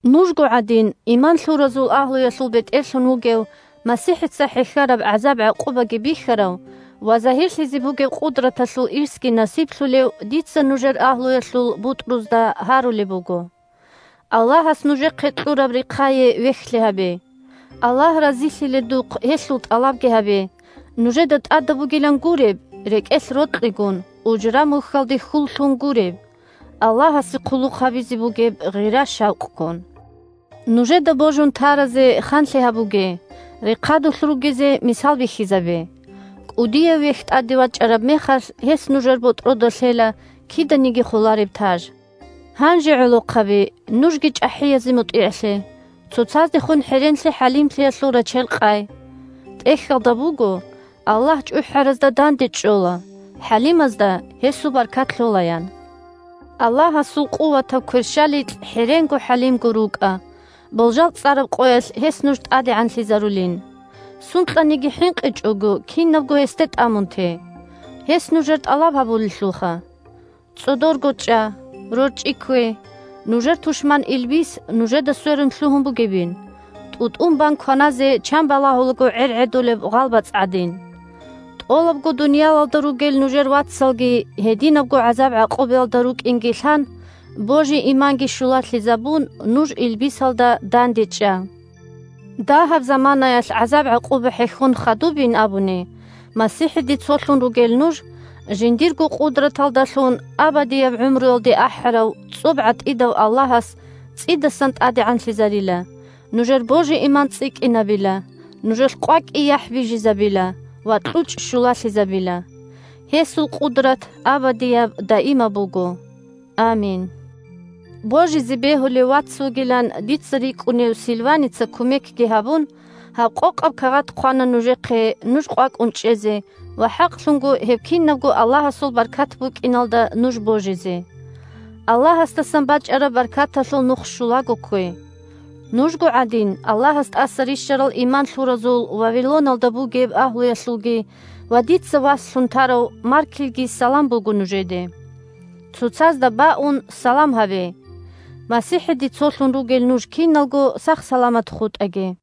Нужго гӀадин, иман лъуразул агьлуялъул бетӀерлъун вугев, МасихӀица хӀехьараб гӀазаб-гӀакъубаги бихьарав ва загьирлъизе бугеб къудраталъул ирсги насиблъулев дица нужер агьлуялъул бутӀрузда гьарулеб буго: Аллагьас нужехъе кьураб рехъае вехьлъи гьабе, Аллагь разилъиледухъ гьелъул тӀалабги гьабе, нужеда тӀадаб бугилан гуреб, – рекӀелъ рокьигун, ужра-мухьалде хьул лъун гуреб, – Аллагьасе хъулухъ гьабизе бугеб гъира-шавкъгун. Нужеда божун таразе ханлъи гьабуге, рехъадулъ ругезе мисал бихьизабе. КӀудияв Вехь тӀаде вачӀараб мехалъ, гьес нужер ботӀрода лъела киданиги холареб таж. Гьанже, гӀолохъаби, нужги чӀахӀиязе мутӀигӀлъе. Цоцаздехун хӀеренлъи-хӀалимлъиялъул рачел къай. ТӀехьалда буго: «Аллагь чӀухӀаразда дандечӀола, хӀалимазда гьесул баркат лъола», – ян. Аллагьасул къуватаб кверщаликь хӀеренго-хӀалимго рукӀа, болжал цӀараб къоялъ гьес нуж тӀадегӀанлъизарулин. Сункьаниги хӀинкъичӀого, кинабго гьесде тӀамун те. Гьес нужер тӀалаб гьабулелъулха. ЦӀодорго чӀа, рорчӀи ккве, нужер тушман илбис нужеда сверун лъугьун бугебин, тӀу-тӀун бан кваназе чан балагьулаго гӀергӀедулеб гъалбацӀ гӀадин. ТӀолабго дуниялалда ругел нужер вацалги гьединабго гӀазаб-гӀакъубаялда рукӀинги лъан, божи-иманги щулалъизабун, нуж илбисалда дандечӀа. Дагьаб заманаялъ гӀазаб-гӀакъуба хӀехьон хадубин абуни, МасихӀиде цолъун ругел нуж, жиндирго къудраталдалъун абадияб гӀумруялде ахӀарав, цӀоб гӀатӀидав Аллагьас цӀидасан тӀадегӀанлъизарила, нужер божи-иман цӀикӀкӀинабила, нужелъ къвакӀи-яхӀ бижизабила ва кьучӀ щулалъизабила. Гьесул къудрат абадияб-даимаб буго! Амин! Божизе бегьулев вац вугилан дица рикӀкӀунев Сильваница кумекги гьабун, гьаб къокъаб кагъат хъвана нужехъе, нуж къвакӀун чӀезе ва хӀакълъунго гьеб кинабго Аллагьасул баркат букӀиналда нуж божизе. Аллагьасдасан бачӀараб баркаталъул нух щулаго ккве. Нужго гӀадин, Аллагьас тӀаса рищарал иман лъуразул Вавилоналда бугеб агьлуялъулги ва дица васлъун тарав Маркилги салам буго нужеде. Цоцазда баун салам гьабе. МасихӀиде цолъун ругел нуж киналго сах-саламат хутӀаги!